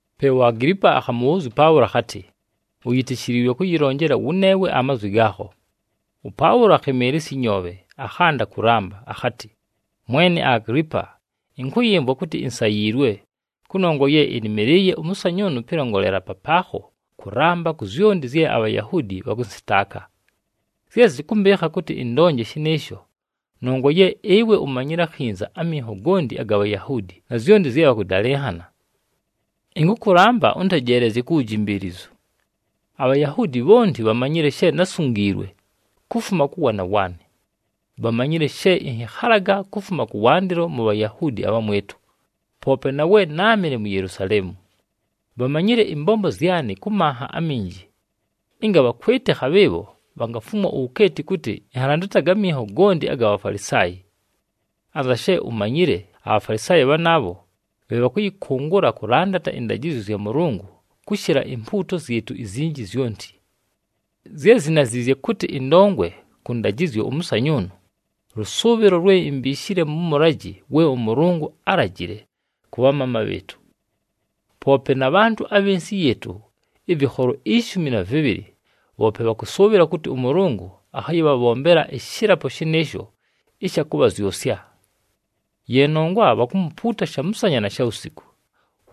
Pe uAgilipa akhamʉbhʉʉzya ʉPaʉlo akhatɨ, “Uyitishiliilwe kʉyɨlonjela wʉneewe amazwi gaakho.” ɄPaʉlo akhɨmɨɨlɨsya ɨnyoobhe, akhanda kʉlamba akhatɨ, “Mwene Agilipa, ɨnkʉyɨmvwa kʉtɨ insayiilwe, kʉnongwa ye ɨnɨmɨlɨɨye ʉmʉsanyʉʉnʉ pɨlongolela papaakho kʉlamba ku zyonti zye aBhayahuudi bhakʉnsɨtaaka. Zye zɨkʉmbɨɨkha kʉtɨ ɨndonje shɨnɨɨsho, nongwa ye ɨwe umanyile akhinza aminho gonti aga Bhayahuudi na zyonti zye bhakʉdalɨnhana. Ɨnkʉkʉlamba ʉntejeelezye ku wujimbiilizu. “ABhayahuudi bhonti bhamanyile she násungiilwe, kufuma kʉ waana waanɨ. Bhamanyile she ɨnhɨkhalaga kufuma kʉwandɨlo mu Bhayahuudi abhamwɨtʉ, poope na we náamɨle mu Yelusaleemu. Bhamanyile ɨmbombo zyanɨ kʉ manha aminji, ɨnga bhakwɨtɨkha, bhɨɨbho bhangafumwa uwukeeti kʉtɨ ɨnhalandataga aminho gonti aga Bhafalisaayi. Anza she umanyile, aBhafalisaayi bhanaabho bhe bhakʉyɨkʉngʉla kʉlandata ɨndajɨzyo zya Mʉlʉngʉ kʉshɨla impuuto zyɨtʉ izinji zyonti. Zye zinaziizye kʉtɨ ɨndongwe kʉ ndajɨzyo ʉmʉsanyʉʉnʉ, lʉsʉʉbhɨlo lwe imbiishile mʉ mʉlajɨ we ʉMʉlʉngʉ álajile kʉ bhamaama bhɨɨtʉ. Poope na bhantʉ abhɨ nsɨ yɨɨtʉ ɨvɨkholo ishumi na vɨbhɨlɨ, bhoope bhakʉsʉʉbhɨla kʉtɨ ʉMʉlʉngʉ akhayɨbhabhombela ɨshɨlapo shɨnɨɨsho ɨsha kʉbhazyʉsya. Ye nongwa bhakumupuuta shamʉsanya na shawusiku.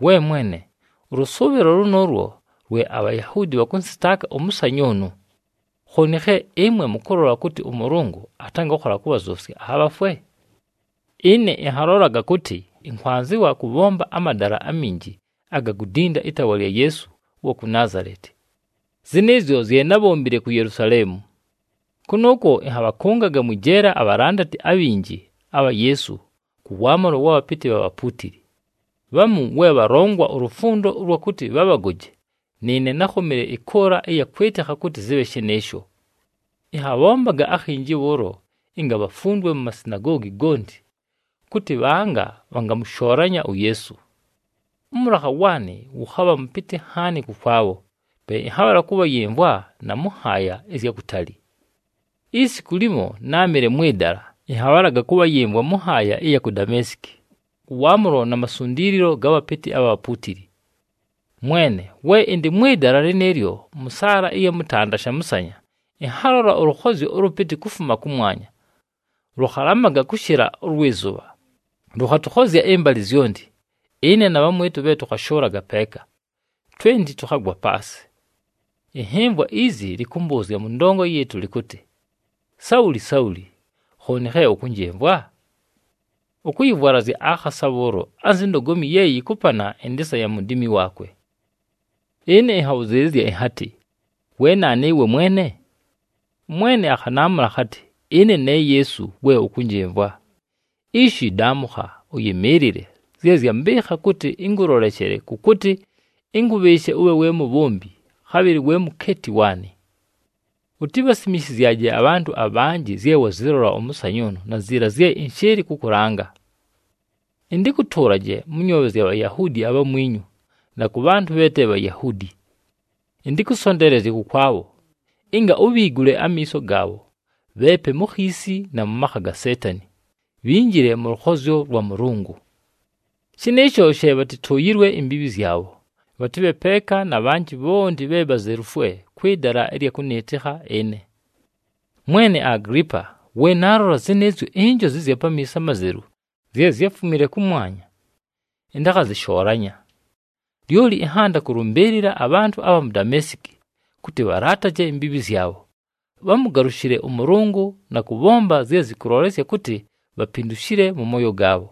We mwene, ʉlʉsʉʉbhɨlo lʉnʉʉlwo lwe aBhayahuudi bhakʉnsɨtaaka ʉmʉsanyʉʉnʉ! Khooni khe ɨmwe mʉkʉlola kʉtɨ ʉMʉlʉngʉ atangakhola kʉbhazyʉsya abhafwe? “Ɨne ɨnhalolaga kʉtɨ, ɨnkwanzɨwa kʉbhomba amadala aminji aga kudinda ɨtaawa lya Yeesu ʉwa ku Naazaleti. Zɨnɨɨzyo zye nábhombile ku Yelusaleemu. Kʉnʉʉkwo ɨnhabhakʉngaga mwɨ jeela abhalandati abhinji abha Yeesu kʉ waamʉlo wa bhapɨtɨ bha bhapuutili. Bhamu we bhalongwa ulufundo ʉlwa kʉtɨ bhabhagoje, nɨɨne nákhomile ɨkʉʉla ɨya kwɨtɨkha kʉtɨ zɨbhe shɨnɨɨsho. Ɨnhabhombaga akhinji bhʉʉlo ɨnga bhafundwe mu masinagoogi gonti, kʉtɨ bhanga bhangamʉshoolanya uYeesu. Ʉmʉlakha waanɨ wʉkhabha mʉpɨtɨ nhaani kʉkwabho, pe ɨnhabhala kʉbhayɨmvwa na mʉ nhaaya ɨzya kutali. “Isiku limo, náamɨle mwɨ dala, ɨnhabhalaga kʉbhayɨmvwa mʉ nhaaya ɨya ku Dameesiki, kʉ waamʉlo na masundiililo ga bhapɨtɨ abha bhapuutili. Mwene, we ɨndɨ mwɨ dala lɨnɨɨlyo, mʉ saala ɨya mʉtanda shamʉsanya, ɨnhalola ʉlʉkhozyo ʉlʉpɨtɨ kufuma kʉmwanya. Lʉkhalamaga kʉshɨla ʉlwɨ zʉbha, lʉkhatʉkhozya ɨmbalɨ zyonti, ɨne na bhamwɨtʉ bhe tʉkhashʉʉlaga peeka. Twenti tʉkhagwa paasɨ. Ɨnhɨmvwa izi lɨkʉmbʉʉzya mʉ ndongo yɨɨtʉ lɨkʉtɨ, ‘Sauli! Sauli! Khooni khe ʉkʉnjɨmvwa? Ʉkʉyɨvwalazya akhasa bhʉʉlo anzi ndogomi ye yɨkʉpana ɨndɨɨsa ya mudiimi waakwe.’ “Ɨne ɨnhabhʉzɨɨlɨzya ɨnhatɨ, ‘We naanu ɨwe Mwene?’ ɄMwene akhanaamʉla akhatɨ, ‘Ɨne ne Yeesu, we ʉkʉnjɨmvwa. Ishi daamʉkha, ʉyɨmɨɨlɨle! Zye zyambɨɨkha kʉtɨ ɨnkʉloleshele kʉ kʉtɨ ɨnkʉbhɨɨshe ʉbhe we mubhombi, khabhɨlɨ we mukeeti waanɨ. Utibhasimishizyaje abhantʉ abhanjɨ zye wazɨlola ʉmʉsanyʉʉnʉ na ziila zye ɨnshɨɨlɨ kʉkʉlanga. Ɨntɨkʉtʉʉlaje mʉ nyoobhe zya Bhayahuudi abhamwinyu, na kʉ bhantʉ bhe te Bhayahuudi. Ɨntɨkʉsonteelezye kʉkwabho, ɨnga ubhiigule amiiso gaabho, bheepe mu khiisi na mʉ makha ga Seetani, bhinjile mʉ lʉkhozyo lwa Mʉlʉngʉ. Shɨnɨɨsho she bhatɨtʉʉyɨlwe imbiibhi zyabho, bhatɨbhe peeka na bhanjɨ bhonti bhe bhazelufwe kwɨ dala ɨlya kʉnɨɨtɨkha ɨne.’ “Mwene Agilipa, we naalola zɨnɨɨzyo injozi ɨzya pamiiso amazelu zye zyáfumile kʉmwanya, ɨntakhazɨshoolanya. Lyoli ɨnhanda kʉlʉmbɨɨlɨla abhantʉ abha mu Dameesiki, kʉtɨ bhalaataje imbiibhi zyabho, bhamʉgalʉshɨle ʉMʉlʉngʉ na kʉbhomba zye zɨkʉlolesya kʉtɨ bhapindushile mʉ mooyo gaabho.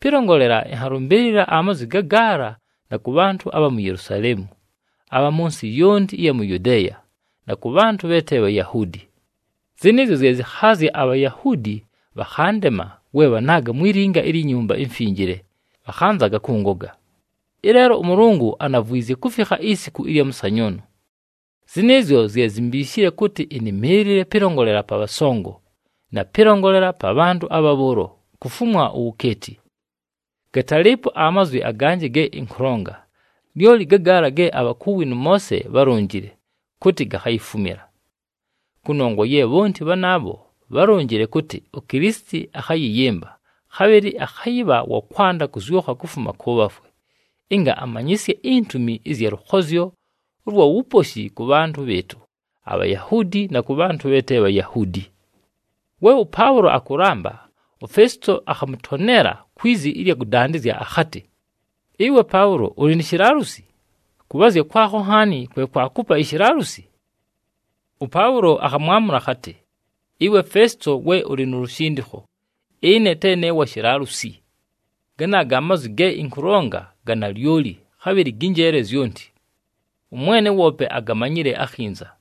Pɨlongolela, ɨnhalʉmbɨɨlɨla amazwi gagaala na kʉ bhantʉ abha mu Yelusaleemu, abha mʉ nsɨ yonti ɨya mu Yudeeya, na kʉ bhantʉ bhe te Bhayahuudi. Zɨnɨɨzyo zye zɨkhaazya aBhayahuudi bhakhandema we bhanaaga mwi linga ilyi Nyumba iMfinjile, bhakhanzaga kʉngoga. Ɨleelo ʉMʉlʉngʉ anavwizye kufikha isiku ɨlya mʉsanyʉʉnʉ. Zɨnɨɨzyo zye zimbiishile kʉtɨ ɨnɨmɨɨlɨle pɨlongolela pa bhasongo, na pɨlongolela pa bhantʉ abha bhʉʉlo kufumwa uwukeeti. Gatalɨɨpo amazwi aganjɨ ge ɨnkʉlonga, lyoli ga gaala ge abhakuwi nʉ Moose bhálonjile, kʉtɨ gakhayifumila. Kʉnongwa ye bhonti bhanaabho bhálonjile kʉtɨ uKilisiti akhayɨyɨmba, khabhɨlɨ akhayɨbha wa kwanda kʉzyʉkha kufuma kʉ bhafwe, ɨnga amanyɨsye intumi ɨzya lʉkhozyo ʉlwa wuposhi kʉ bhantʉ bhɨɨtʉ aBhayahuudi, na kʉ bhantʉ bhe te Bhayahuudi.” We ʉPaʉlo akʉlamba, uFesito akhamʉtoneela kwi zi ɨlya kʉdandɨzya akhatɨ, “Ɨwe Paʉlo! Ʉlɨ ni shilaalusi! Kʉbhaazya kwakho nhaani kwe kwakupa ishilaalusi!” ɄPaʉlo akhamwamʉla akhatɨ, “Ɨwe Fesito we ʉlɨ nu lushindikho, ɨne te ne wa shilaalusi. Ganaaga amazwi ge ɨnkʉlonga ga nalyoli, khabhɨlɨ gɨ njeele zyonti. Ʉmwene woope agamanyile akhinza.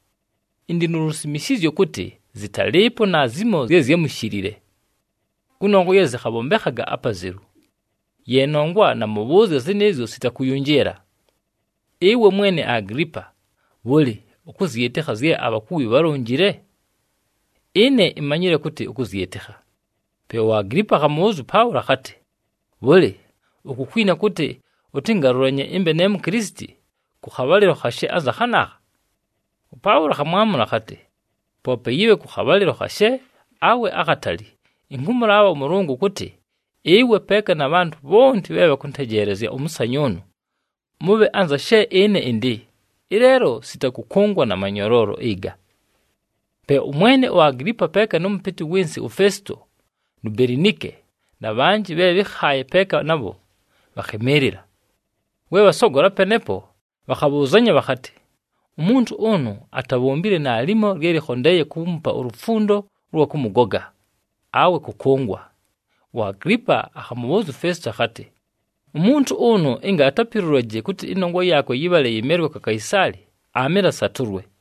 Ɨndɨ nu lusimishizyo kʉtɨ zɨtalɨɨpo naazimo zye zyámushilile, kʉnongwa ye zɨkhabhombekhaga apazelu. Ye nongwa namʉbhʉʉzya zɨnɨɨzyo sita kʉyʉnjɨɨla. Ɨwe mwene Agilipa, bhʉlɨ, ʉkʉzyɨtɨkha zye abhakuwi bhalonjile? Ɨne imanyile kʉtɨ ʉkʉzyɨtɨkha.” Pe uAgilipa akhamʉbhʉʉzya ʉPaʉlo akhatɨ, “Bhʉlɨ, ukukwina kʉtɨ ʉtɨngalʉlanye ɨmbe ne Mukilisiti kʉ khabhalɨlo khashe anza khanaakha?” ɄPaʉlo akhamwamʉla akhatɨ, “Poope yɨbhe kʉ khabhalɨlo khashe, awe akhatali, ɨnkʉmʉlaabha ʉMʉlʉngʉ kʉtɨ ɨwe peeka na bhantʉ bhonti bhe bhakʉntejeelezya ʉmʉsanyʉʉnʉ, mʉbhe anza she ɨne ɨndɨ, ɨleelo sita kʉkʉngwa na manyoloolo ɨga.” Pe ʉmwene uAgilipa peeka nʉ mʉpɨtɨ wɨ nsɨ uFesito nu Belinike, na bhanjɨ bhe bhɨ́khaaye peeka nabho bhakhɨmɨɨlɨla. We bhasogola penepo, bhakhabhʉʉzanya bhakhatɨ, “Umuntu ʉnʉ atabhombile naalimo lye lɨkhondeeye kuumupa ulufundo ʉlwa kʉmʉgoga, awe kʉkʉngwa.” UAgilipa akhamʉbhʉʉzya uFesito akhatɨ, “Umuntu ʉnʉ ɨnga atapilulaje kʉtɨ ɨnongwa yaakwe yɨbhale yɨmelwe kwa Kaisaali, aamɨle asatʉlwe.”